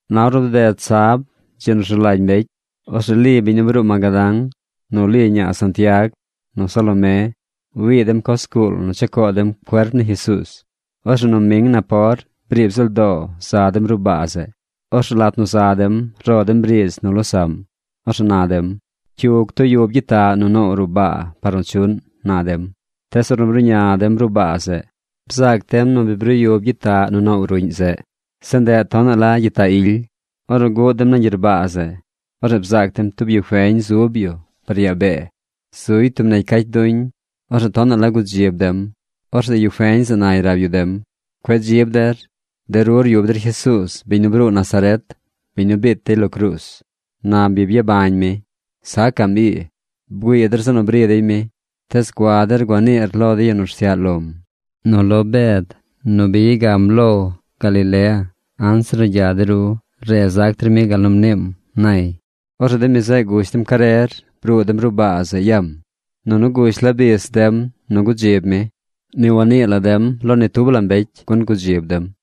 Na ornu bded sab, dzi nu rzu lagy mbecy, orzeꞌ Li biñ nu bruu Magadán, nu Li ñaa Santiag, nu Salomé wii dem coz zguul nu cha coo dem cuerp ni Jesuuz. Orzeꞌ noming napor, briib ziꞌl doo za dem ruꞌ baa zeꞌ. Orzeꞌ lat nu za dem, ro dem riidz nu losaꞌm. Orzeꞌ na dem: ―¿Cyu ctuyub gyitaꞌ nu noow ruꞌ baa par nu chuꞌn? ―na dem. Tees ornu bruꞌña dem ruꞌ baa zeꞌ, bzaac dem nu bi bruu yub gyitaꞌ nu noow ruꞌñ zeꞌ. Zeꞌ ndeꞌ tonaꞌ la gyitaꞌ ily. Ornu guꞌ dem nañ gyerbaa zeꞌ, orzeꞌ bzaac dem tub yu feñ zub yu par yaa bee. Zuy tub negy cacy duñ. Orzeꞌ tonaꞌ la gudzib dem. Orzeꞌ yu feñ zeꞌ nay rab yu dem: ―Cueꞌ dzib der. De ru ryub der Jesuuz biñ nu bruu Nazaret, biñ nu biit dey lo cruuz. Na bi byabañ mi. Sacaꞌm ii. Bgüii der zeꞌ nu bri dey mi. Tees gua der gua niir lo de yu nu rsyaꞌ lom nu lo Bed nu bi ya gam lo dey par Galilea. Re zac der mi gal nu mniim ―nay. Orzeꞌ de mi zeꞌ gush dem carer bruu dem ruꞌ baa zeꞌ yam. Nunu gush la bis nim nu gudzib mi. Ni wannii la dem lo ni tub la mbecy gun gudzib dem.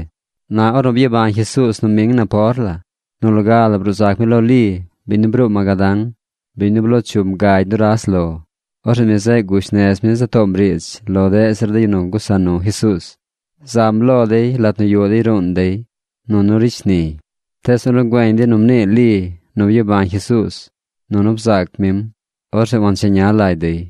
Na ornu byabañ Jesuuz noming napor la, nu loga la bruu zac mi lo Li, biñ nu bruu Magadán, biñ nu bloo chum gagy nuras lo. Orzeꞌ mi zeꞌ gush nez mi za toom riidz lo deꞌ zir de yu nu gusa nu Jesuuz. Zam lo dey lat nu yuꞌ dey ruun dey nunu ricy shniy. Tees ornu güeñ dey nu mnii Li nu byabañ Jesuuz nunu bzaac mim, orzeꞌ wancheña lagy dey.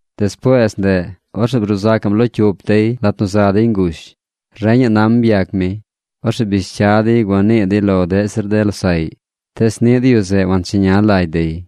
Despuees ndeꞌ, orzeꞌ bruu sacaꞌm lo cyup dey lat nu za dey ngush. Reñaꞌ nam byac mi. Orzeꞌ bish cya dey gua nii dey lo deꞌ zir de losaꞌy. Tees niꞌ de yu zeꞌ wancheña lagy dey.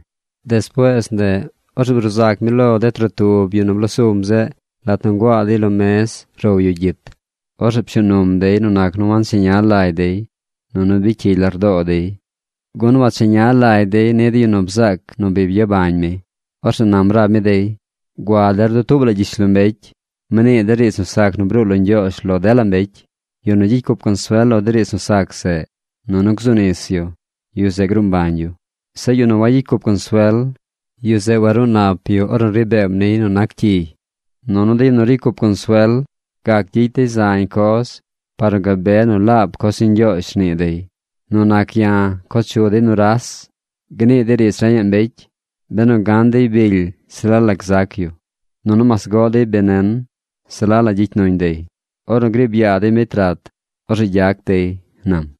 Despuees ndeꞌ, orzeꞌ bruu zac mi lo de trotub yu nu bloo sum zeꞌ lat nu nguaa dey lo mez row yu gyit. Orzeꞌ pshuu num dey nu nac nu wancheña lagy dey nunu bicy cyigy lardoo dey, gun wacheña lagy dey ni de yu nu bzaac nu bi byabañ mi. Orzeꞌ nam rab mi dey: ―Gua der dutuub la gyishlombecy. Mnii der riidz nu sac nu bruu lo Ñgyoozh lo dela mbecy. Yu nu gyicy cup consuel lo de riidz nu sac zeꞌ nunu gzu nis yu, yu zeꞌ gruu mbañ yu. Zeꞌ yu nu wagyicy cup consuel, yu zeꞌ waruu nap yu ornu ri beem niy nu nac cyiy. Nunu de yu nu ricy cup consuel gac gyicy dey zañ coz par nu gabe nu laab coz ni Ñgyoozh rnii dey. Nu nac ya̱ co chu dey nuras. Gnii dey riidz reñaꞌ mbecy. Benu gan dey bily se la la gzac yu. Nunu mas goꞌ dey benen se la la gyicy nuñ dey. Ornu griib yaa dey mbecy rat, orzeꞌ gyac dey ―nam.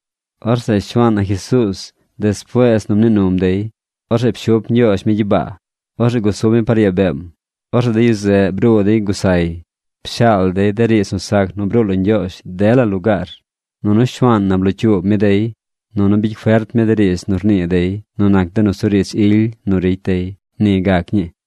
Orzeꞌ Shuaan na Jesuuz despuees nu mnii num dey, orzeꞌ pshup Ñgyoozh mi gyibaa. Orzeꞌ gusub mi par yaa beem. Orzeꞌ de yu zeꞌ bruu dey gusay, pshaal dey de riidz nu sac nu bruu lo Ñgyoozh dela lugaar. Nunu Shuaan na blocyuub mi dey, nunu bicy fert mi de riidz nu rnii dey nu nac de nusuriidz ily nu ricy dey. Ni gac ñii.